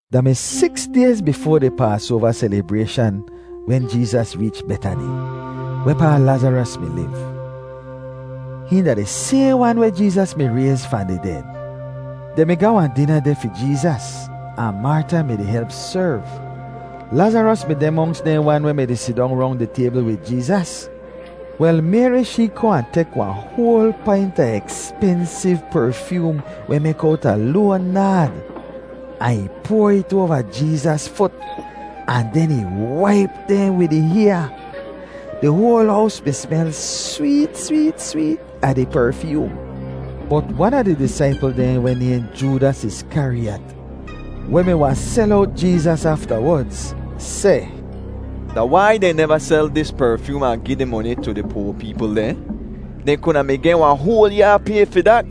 Da mi siks dayz bifoa di Paasoava selibrayshan wen Jeezas reech Betani, wehpaa Lazaros mi liv. Hihn da di sayhn wan weh Jeezas mi rayz fahn di ded. Dehn mi-di ga wahn dina deh fi Jeezas, ahn Marta mi-di help serv. Lazaros mi deh monks dehn wan weh mi sidong rong di taybl wid Jeezas. Wel, Mayri shee kohn ahn tek wahn hoal paint a ekspensiv perfyoom weh mek owta loan naad, ahn ih poar it oava Jeezas fut ahn den ih waip dehn wid ih hyaa. Di hoal hows mi smel sweet, sweet, sweet a di perfyoom. Bot wan a di disaipl dehn weh nayhn Joodas Iskariyat, weh mi wahn sel owt Jeezas aftawodz, seh, “Da wai dehn neva sel dis perfyoom ahn gi di moni tu di poa peepl dehn? Dehn kuda mi geh wahn hoal yaa pay fi dat.”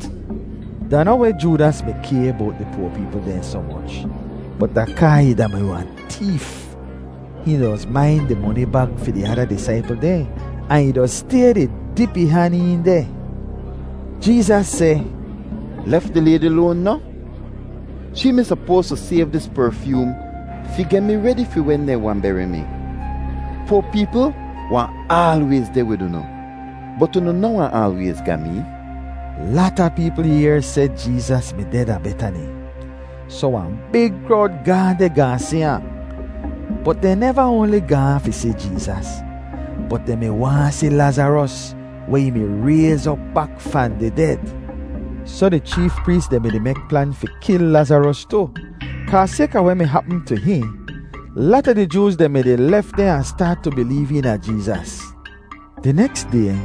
Da noh weh Joodas mi kay bowt di poa peepl dehn soh moch, bot da kaa ih da-mi wahn teef. Hihn doz main di moni bag fi di ada disaipl dehn ahn ih doz stay di dip ih han een deh. Jeezas seh, “Lef di laydi loan noh? Shee mi sopoas tu sayv dis perfyoom fi geh mi redi fi wen dehn wahn beri mi. Poa peepl wahn aalwayz deh wid unu, bot unu noh wahn aalwayz ga mee.” Lata peepl yehr seh Jeezas mi deh da Betani, soh wahn big krowd gaahn deh gaahn si ahn. Bot dehn neva oanli gaahn fi si Jeezas, bot dehn mi waahn si Lazaros weh ih mi rayz op bak fahn di ded. Soh di cheef prees dehn mi-di mek plan fi kil Lazaros tu, kaa sayka weh mi hapm tu hihn, lata di Jooz dehn mi-di lef dehn ahn staat tu bileev eena Jeezas. Di neks day,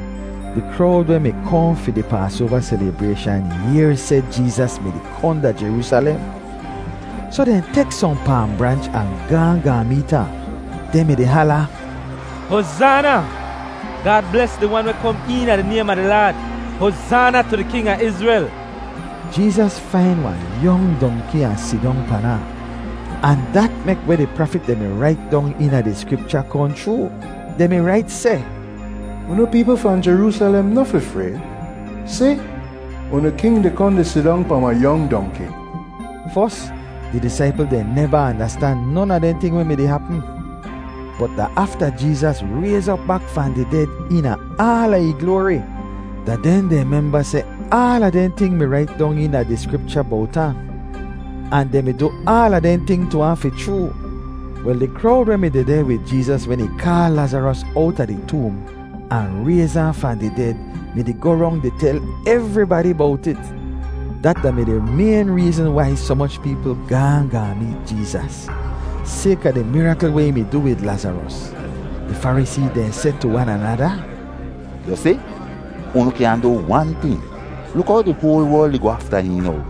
di krowd weh mi kohn fi di Paasoava selibrayshan yehr seh Jeezas mi-di kohn da Jeroosalem. Soh dehn tek sohn paam branch ahn gaahn gaahn meet ahn. Dehn mi-di hala, “Hozaana! Gaad bles di Wan weh kom eena di naym a di Laad! Hozaana tu di king a Izrel!” Jeezas fain wahn yong dongki ahn sidong pan ahn, ahn dat mek weh di prafit dehn mi rait dong eena di Skripcha kohn chroo. Dehn mi rait seh, “Unu peepl fahn Jeroosalem noh fi frayd. Si, unu king di kohn di sidong pahn wahn yong dongki.” Fos, di disaipl dehn neva andastan non a dehn ting weh mi-di hapm. Bot da afta Jeezas rayz op bak fahn di ded eena aala ih gloari, da den dehn memba seh aala dehn ting mi rait dong eena di Skripcha bowt ahn, ahn dehn mi du aala dehn ting tu ahn fi chroo. Wel, di krowd weh mi dehdeh wid Jeezas wen ih kaal Lazaros owta di toom ahn rayz ahn fahn di ded mi-di goh rong di tel evribadi bowt it. Dat da-mi di mayn reezn wai soh moch peepl gaahn gaahn meet Jeezas, sayka di mirakl weh ih mi du wid Lazaros. Di Farisee dehn seh tu wan anada, “Yu si, unu kyaahn du wan ting. Luk how di hoal werl di goh afta hihn now.”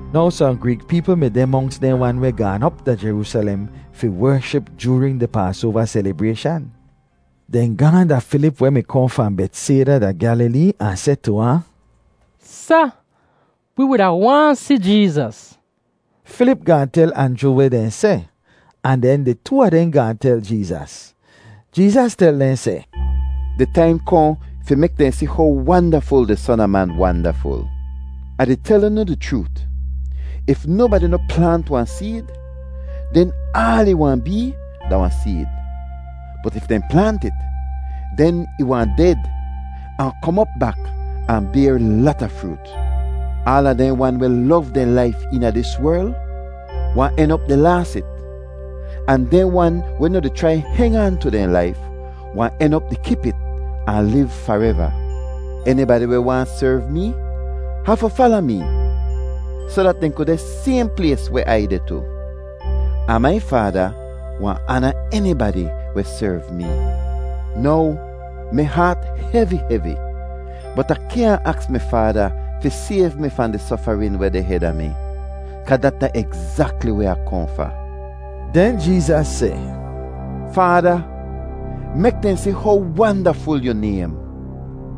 Now sohn Greek peepl mi deh monks dehn wan weh gaan op da Jeroosalem fi wership joorin di Paasoava selibrayshan. Dehn gaahn da Filip weh mi kohn fahn Betsayda da Gyalilee ahn seh tu ahn, “Sa, wi wuda waahn si Jeezas.” Filip gaahn tel Anjru weh dehn seh, ahn den di too a dehn gaahn tel Jeezas. Jeezas tel dehn seh, “Di taim kohn fi mek dehn si how wandaful di Son a Man wandaful. Ah di tel unu di chroot; if nobadi noh plaant wahn seed, den aal ih wahn bee da wahn seed. Bot if dehn plaant it, den ih wahn ded ahn kom op bak ahn bayr lata froot. “Aala dehn wan weh lov dehn laif eena dis werl wahn en op di laas it; ahn dehn wan weh noh di chrai heng aan tu dehn laif wahn en op di kip it ahn liv fareva. Enibadi weh waahn serv mee hafu fala mee, soh dat dehn ku deh sayhn plays weh Ai deh tu. Ahn mai Faada wahn aana enibadi weh serv mee. “Now mi haat hevi, hevi, bot Ah kyaahn aks mi Faada fi sayv mi fahn di sofarin weh deh heda mi, kaa dat da egzakli weh Ah kohn fa.” Den Jeezas seh, “Faada, mek dehn si how wandaful yu naym.”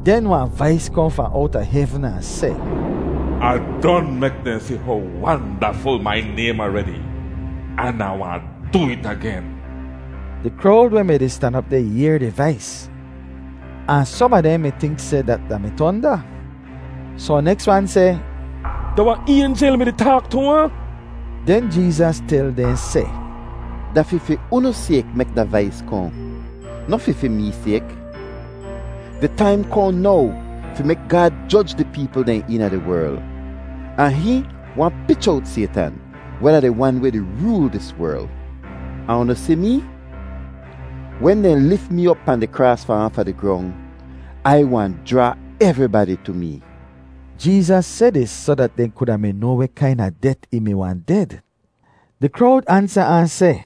Den wahn vais kohn fahn owta hevn ahn seh, “Ah don mek dehn si how wandaful mai naym aredi, an Ah wahn du it agen.” Di krowd weh mi-di stan op deh yehr di vais, ahn som a dehn mi tink seh dat da-mi tonda. Sohn neks wan seh, “Da wahn aynjel mi-di taak tu ahn.” Den Jeezas tel dehn seh, “Da fi fi unu sayk mek da vais kohn, noh fi fi mee sayk. Di taim kohn now fi mek Gaad joj di peepl dehn eena di werl, ahn hihn wahn pich owt Saytan, weh da di wan weh di rool dis werl. Ahn unu si mee? Wen dehn lif mee op pahn di kraas fahn aafa di grong, Ai wahn jraa evribadi tu mee.” Jeezas seh dis soh dat dehn kuda mi noa weh kaina det ih mi wahn ded. Di krowd ansa ahn seh,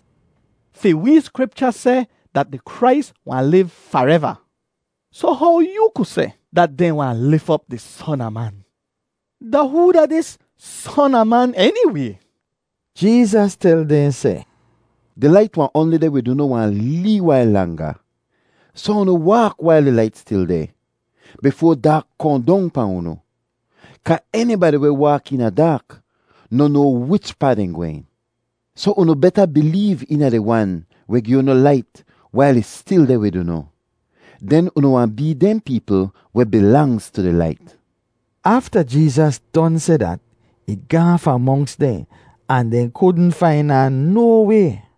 “Fi wee Skripcha seh dat di Krais wahn liv fareva. Soh how yoo ku seh dat dehn wahn lif op di Son a Man? Da hoo da dis ‘Son a Man’ eniway?” Jeezas tel dehn seh, “Di lait wahn oanli deh wid unu wahn lee wail langa. Soh unu waak wail di lait stil deh, bifoa daak kohn dong pahn unu, kaa enibadi weh waak eena daak noh noa wichpaa dehn gwehn. Soh unu beta bileev eena di Wan weh gi unu lait wail ih stil deh wid unu; den unu wahn bee dehn peepl weh bilangz tu di lait.” Afta Jeezas don seh dat, ih gaahn fahn monks dehn ahn dehn kudn fain ahn no way.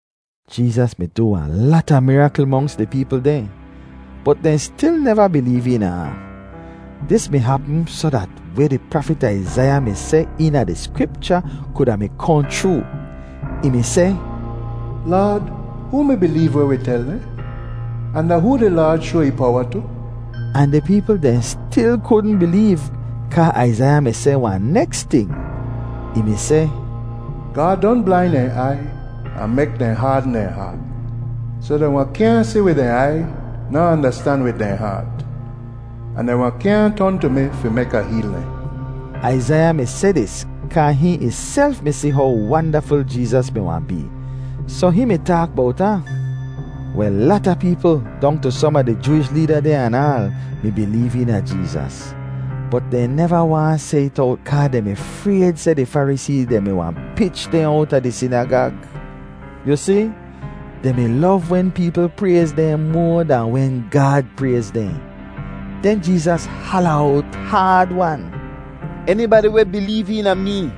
Jeezas mi du wahn lata mirakl monks di peepl dehn, bot dehn stil neva bileev eena ahn. Dis mi hapm soh dat weh di prafit Aizaiya mi seh eena di Skripcha kuda mi kohn chroo. Ih mi seh, “Laad, hoo mi bileev weh wi tel dehn? Ahn da hoo di Laad shoa ih powa tu?” Ahn di peepl dehn stil kudn bileev kaa Aizaiya mi seh wahn neks ting. Ih mi seh, “Gaad don blain dehn aiy ahn mek dehn haadn dehn haat, soh dehn wahn kyaahn si wid dehn aiy ner andastan wid dehn haat, ahn dehn wahn kyaahn ton tu mi fi mek Ah heel dehn.” Aizaiya mi seh dis kaa hihn ihself mi si how wandaful Jeezas mi wahn bee, soh hihn mi taak bowt ahn. Wel, lata peepl, dong tu som a di Jooish leeda dehn anaal, mi bileev eena Jeezas. Bot dehn neva waahn seh it owt kaa dehn mi frayd seh di Farisee dehn mi wahn pich dehn owta di sinagag. Yu si, dehn mi lov wen peepl prayz dehn moa dahn wen Gaad prayz dehn. Den Jeezas hala owt haad-wan, “Enibadi weh bileev eena mee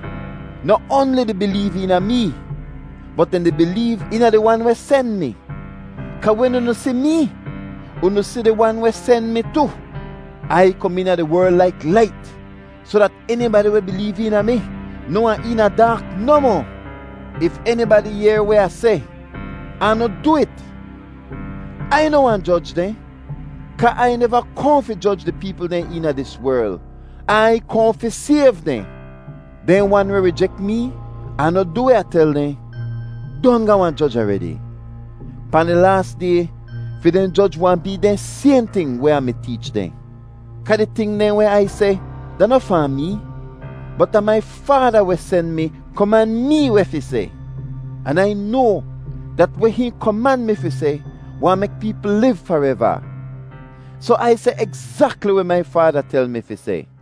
noh oanli di bileev eena mee, bot dehn di bileev eena di Wan weh sen mi. Kaa wen unu si mee, unu si di Wan weh sen mi tu. Ai kom eena di werl laik lait soh dat enibadi weh bileev eena mi noh wahn eena daak nohmoh. “If enibadi yehr weh Ah seh ahn noh du it, Ai noh wahn joj dehn, kaa Ai neva kohn fi joj di peepl dehn eena dis werl; Ai kohn fi sayv dehn. Dehn wan weh rijek mee, ahn noh du weh Ah tel dehn, don ga wahn joj aredi; pahn di laas day, fi dehn joj wahn bee dehn sayhn ting weh Ah mi teech dehn. Kaa di ting dehn weh Ai seh da noh fahn mee, bot da mai Faada weh sen mi koman mee weh fi seh. An Ai noa dat weh hihn koman mi fi seh wahn mek peepl liv fareva. Soh Ai seh egzakli weh mai Faada tel mi fi seh.”